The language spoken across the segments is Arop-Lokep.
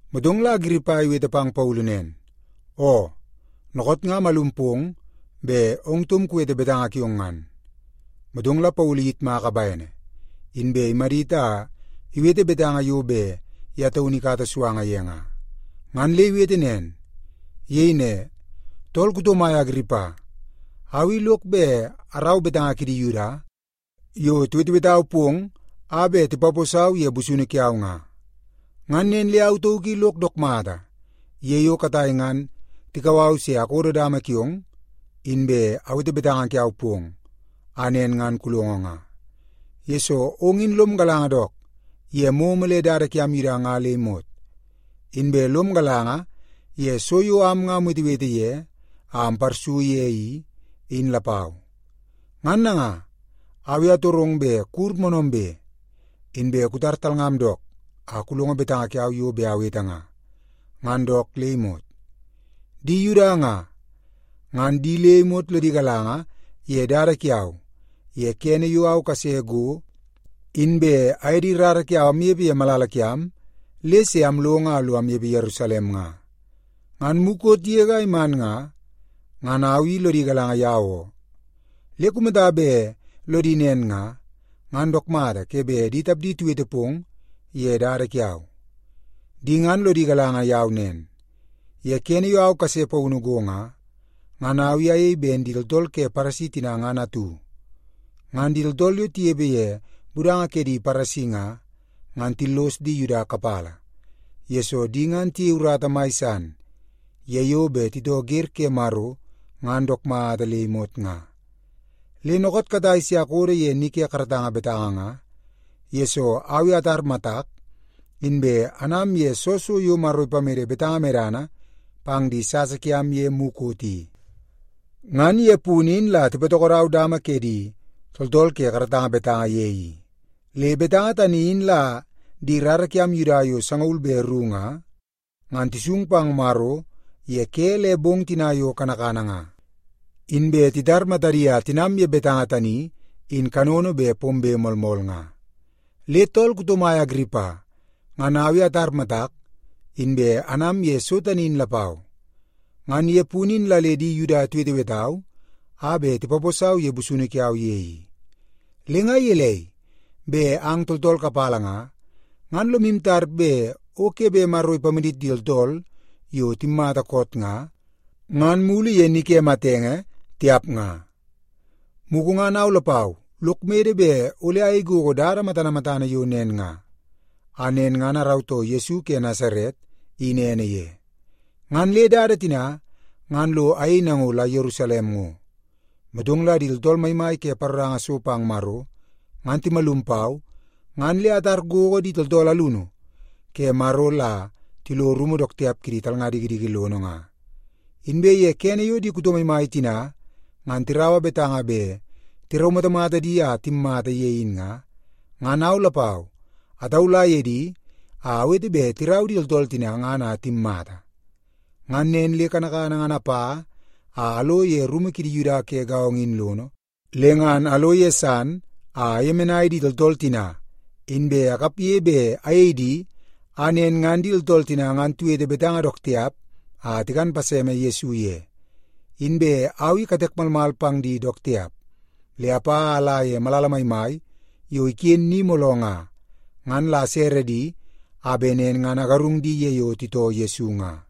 Motong la Agiripa iwete pang Paulu nen, “Oo, dookoot nga amalum pong bet ong taum kuwete betanga kiong ngan.” Motong la Paulu iyitmaka bene, inbe imadit a iwete betanga yo bet ye taunu ikata suanga ye nga, ngan le iwete nen. Iyei ne, “Tool kuto mai Agiripa, au i lok bet arau betanga kidi Yuda yo tiwetewetau pong a bet tipaposau ye busunu kiau nga. Ngan nen le au tauk i lok dook mata ye yo katai ngan tikau au se akodo dama kiong, inbe awete betanga kiau pong a nen ngan kulongo nga, yesoo ong in lom galanga dook ye momo le dada kiam Yuda nga le imot. Inbe lom galanga ye so yo am nga amwetewete ye a amparsu ye i, in lapau. Ngan nanga, au i atorong bet kuwur moonoombe, inbe kutar talngam dook a kulongo betanga kiau yo bet awete nga, ngan dook le imot. “Di Yuda nga, ngan di le imot lodi galanga ye dada kiau ye kene yo au kase go inbe aye di rara kiau amnepe ye malala kiam, le se along a lo anepe Yerusalem nga. Ngan mukot yege a iman nga, ngan au i lodi galanga yau oo. Le kumata bet lodi nen nga, ngan dook mata ke bet di tapdi tiwete pong ye dada kiau. Di ngan lodi galanga yau nen, ye kene yo au kase paunu go nga, ngan au i ayei ben di tooltool ke Paresi tina ngan atu. Ngan di tooltool yo tinepe ye budanga ke di Paresi nga, ngan tillos di Yuda kapala, yesoo di ngan tiyei urata mai san ye yo bet titoo wer ke Maro ngan dook mata le imot nga. Le dookoot katai se akodo ye ni ke karatanga betanga nga, yesoo au i atar matak, inbe anam ye soo so yo Maro ipamede betanga medana pang di sasa kiam ye mukot i. Ngan ye punu in la tipatokodau dama ke di tooltool ke karatanga betanga ye i. Le betanga tani in la di rara kiam Yuda yo sangaul be ru nga, ngan tisung pang Maro ye ke le bong tina yo kanakana nga, inbe titar matadi a tinam ye betanga tani in kanono bet pombe moolmool nga. Le tool kuto mai Agiripa, ngan au i atar matak, inbe anam ye so tani in lapau. Ngan ye punu in la le di Yuda tiwetewetau a bet tipaposau ye busunu kiau ye i. Le nga gelei, bet ang tooltool kapala nga, ngan lomu tar bet o ke bet Maro ipamadit di tooltool yo timmata koot nga, ngan mulu ye ni ke matenge, tiap nga? “Mugu ngan au lapau lok mede bet ole ayei gogo dada matana matana yo nen nga, a nen ngan arautoo Yesu ke Nasaret in ene ye. Ngan le dada tina ngan lo ayei nango la Yerusalem ngo. Motong la di tooltool maimai ke paroranga so pang Maro ngan timalum pau, ngan le atar gogo di tooltool alunu ke Maro la tilo rumu dook tiap kidi talnga dikidiki lono nga. Inbe ye kene yo di kuto maimai tina ngan tiraua betanga bet tiraumatamata di a timmata ye in nga, ngan au lapau ataula ye di a awete bet tirau di tooltool tina ngan a timmata. Ngan nen le kanakana ngan apa a alo ye rumu kidi Yuda ke gaongo in lono, le ngan alo ye san a ayemenai di tooltool tina, inbe akapge bet ayei di a nen ngan di tooltool tina ngan tiwete betanga dook tiap a tikan paseme Yesu ye. Inbe au i katek malmal pang di dook tiap, le apa a ala ye malala maimai yo iken ni mooloo nga, ngan la asere di a bet nen ngan agarung di ye yo titoo Yesu nga.”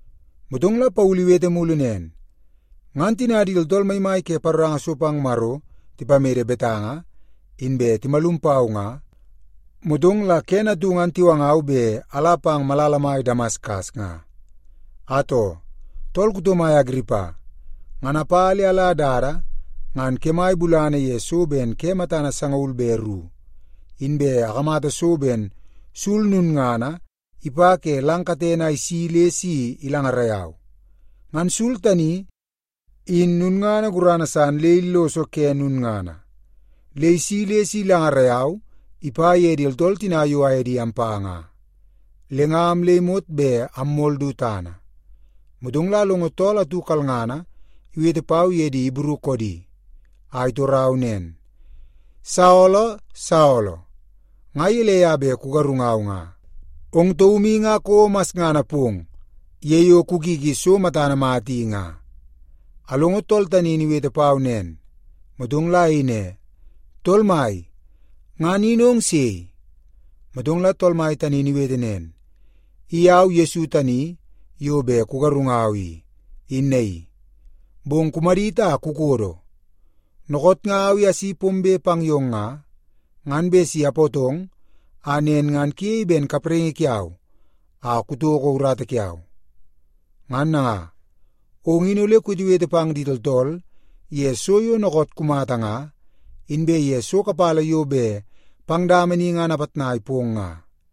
Motong la Paulu iwete mulu nen, “Ngan tina di tooltool maimai ke paroranga so pang Maro tipamede betanga inbe timalum pau nga, motong la kene atu ngan tiwangau bet ala pang malala mai Damaskas nga. Atoo, tool kuto mai Agiripa, ngan apa le ala dada ngan kemai bulana ye so ben ke matana sangaul be ru, inbe akamata so ben sul lulngana ipa ke lang katene a isi le si ilangarai au. Ngan sul tani, in lulngana gurana san le illoso ke lulngana, le isi le si ilangarai au ipa ye di tooltool tina yo aye di ampa nga. Le nga am le imot bet ammol du tana. Motong la alongo tool atu kalngana iwete pau ye di Ibru koodi, a itorau nen, ‘Saolo, Saolo, nga gelei a bet kugarungau nga? Ong taum i nga kouo masngana pong ye yo kukiki so matana mata i nga.’ “Alongo tool tani in iwete pau nen, motong la ayei ne, ‘Tool Mai, ngan in ong sei?’ “Motong la Tool Mai tani in iwete nen, ‘I au Yesu tani yo bet kugarungau i, in naii. Bong kumadit a kukodo. Dookoot nga au i asi pombe pang yong nga, ngan bet si apootong a nen ngan kuyei ben kapraingi kiau a kutoko urata kiau. Ngan nanga, ong in ole kuwetewete pang di tooltool ye so yo dookoot kumata nga, inbe ye so kapala yo bet pang dama ni ngan apitnai pong nga.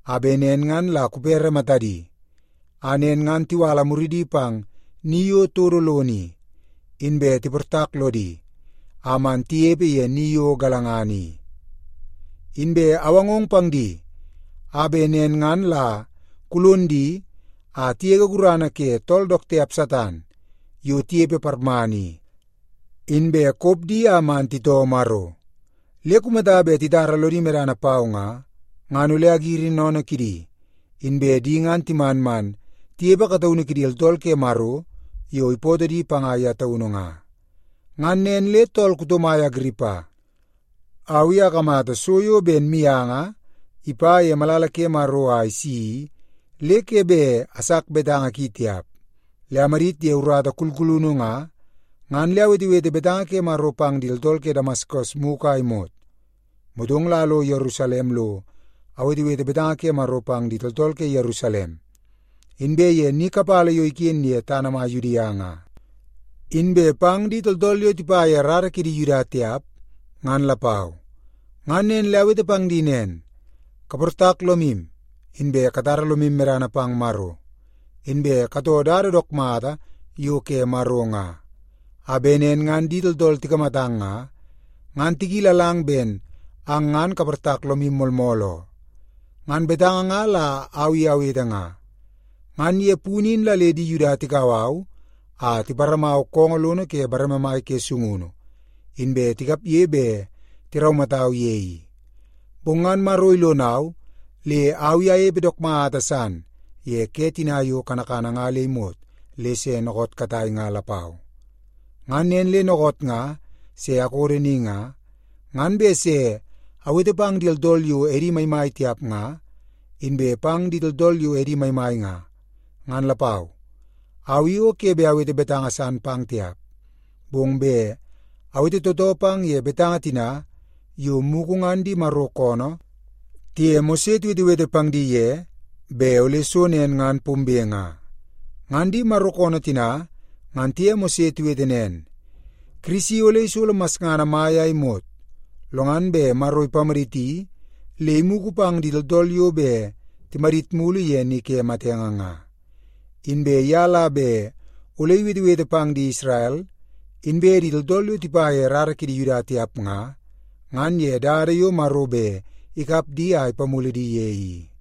a bet nen ngan la kupere matadi, a nen ngan tiwala muridi pang ni yo todo lono i, inbe tiportak lodi a man tinepe ye ni yo galangana i. Inbe awangong pang di a bet nen ngan la kulon di a tigege gurana ke tool dook tiap Satan yo tinepe parmana i, inbe kop di a man titoo Maro. Le kumata bet titara lodi medana pau nga, ngan ole agiri sennene kidi, inbe di ngan timan man tinepe kataunu kidi tooltool ke Maro yo ipootoo di panga ye taunu nga.’ “Ngan nen le tool kuto mai Agiripa, au i akamata so yo ben mianga ipa ye malala ke Maro a isi i, le ke bet asak betanga ki tiap. Le amadit ye urata kulkulunu nga, ngan le awetewete betanga ke Maro pang di tooltool ke Damaskas mugu a imot, motong la alo Yerusalem lo awetewete betanga ke Maro pang di tooltool ke Yerusalem, inbe ye ni kapala yo iken ye tana mai Yudia nga, inbe pang di tooltool yo tipa ye rara kidi Yuda tiap, ngan lapau. Ngan le awete pang di nen, ‘Kaportak lomu, inbe katara lomu medana pang Maro. Inbe katoo dada dook mata yo ke Maro nga, a bet nen ngan di tooltool tikamatang nga, ngan tikilalang ben ang ngan kaportak lomu moolmool oo.’ Ngan betanga nga la au i awete nga. Ngan ye punu in la le di Yuda tikau au a tiparamau koongoo lono ke bareme mai ke sungunu, inbe tikapge bet tiraumatau ye i. Bong ngan Maro ilonau le au i anepe dook mata san ye ke tina yo kanakana nga le imot le se dookoot katai nga lapau. Ngan nen le dookoot nga se akodo ni nga, ngan bet se awete pang di tooltool yo edi maimai tiap nga, inbe pang di tooltool yo edi maimai nga, ngan lapau. Au i o ke bet awete betanga san pang tiap, bong bet awete tootoo pang ye betanga tina yo mugu ngan di Maro koonoo tiye Mose tiwetewete pang di ye bet ole so nen ngan pombe nga. Ngan di Maro koonoo tina ngan tiye Mose tiwete nen, ‘Kirisi ole isolo masngana mai a imot, lo ngan bet Maro ipamaditi le imugu pang di tooltool yo bet timadit mulu ye ni ke matenge nga. Inbe ye la bet ole iwetewete pang di Isrel, inbe di tooltool yo tipa ye rara kidi Yuda tiap nga, ngan ye dada yo Maro bet ikap di a ipamulu di ye i.’”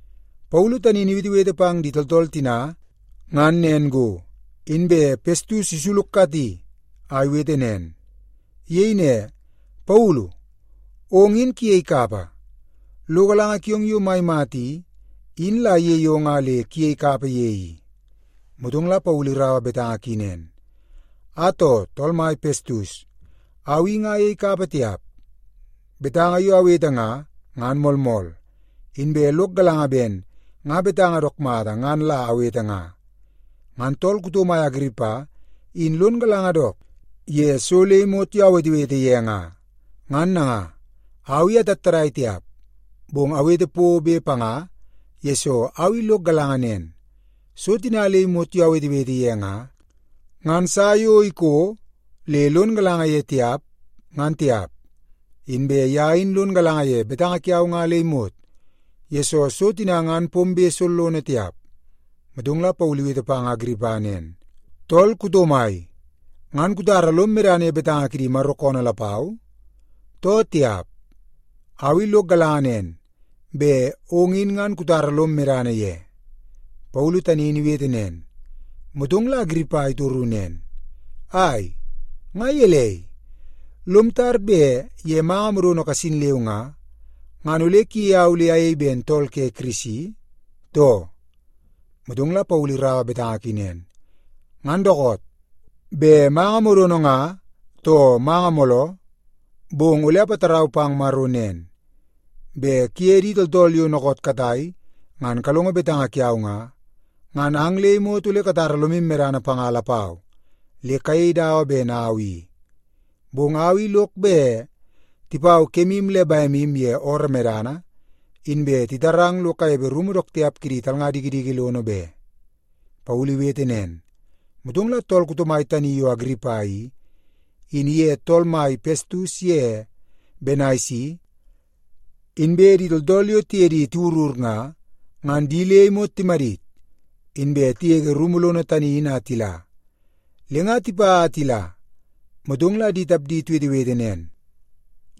Paulu tani in iwetewete pang di tooltool tina ngan nen go, inbe Pestus isulukati a iwete nen. Iyei ne, “Paulu! Ong in kuyei kapa! Lo galanga kiong yo mai mata i, in la iyei ong a le kuyei kapa ye i.” Motong la Paulu iraua betanga ki nen, “Atoo, tool mai Pestus, au i nga ayei kapa tiap. Betanga yo awete nga, ngan moolmool, inbe lok galanga ben nga betanga dook mata ngan la awete nga. Ngan tool kuto mai Agiripa in lon galanga dook ye so le imot yo awetewete ye nga. Ngan nanga, au i atattadai tiap, bong awete pobe panga, yesoo au i lok galanga nen, so tina le imot yo awetewete ye nga, ngan sa yo iko le lon galanga ye tiap, ngan tiap. Inbe ye in lon galanga ye betanga kiau nga le imot, yesoo so tina ngan pombe sollono tiap.” Motong la Paulu iwete pang Agiripa nen, “Tool kuto mai, ngan kutara lom medana ye betanga kidi Maro koonoo lapau, too tiap? Au i lok galanga nen, bet ong in ngan kutara lom medana ye.” Paulu tani in iwete nen, motong la Agiripa itoru nen, “Ai, nga gelei? Lom tar bet ye manga modono kasin leu nga, ngan ole kuyei au le ayei ben tool ke Kirisi, too?” Motong la Paulu iraua betanga ki nen, “Ngan dookoot, bet manga modono nga too manga mooloo, bong ole apatarau pang Maro nen, bet kuye di tooltool yo dookoot katai ngan kalongo betanga kiau nga, ngan ang le imot ole katara lomu medana panga lapau le kayei dawa ben au i. Bong au i lok bet tipau kemu le bemu ye ooroo medana, inbe titarang lo kanepe rumu dook tiap kidi talnga dikidiki lono be.” Paulu iwete nen, motong la tool kuto mai tani yo Agiripa i, in iye tool mai Pestus ye Benaisi, inbe di tooltool yo tiye di tiwurur nga, ngan di le imot timadit, inbe tigege rumu lono tani in a tila. Le nga tipa a tila, motong la di tapdi tiwetewete nen,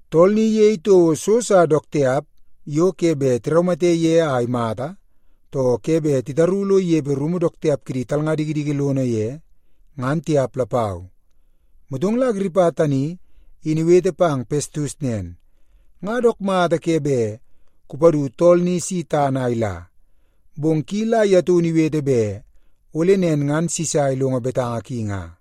“Tool ni iyei toko so sa dook tiap yo ke bet tiraumate ye a imata, too ke bet titaru lo inepe rumu dook tiap kidi talnga dikidiki lono ye, ngan tiap lapau.” Motong la Agiripa tani in iwete pang Pestus nen, “Nga dook mata ke bet kupadu tool ni si tana a ila, bong ki la ye taunu iwete bet ole nen ngan Sisa ilongo betanga ki nga.”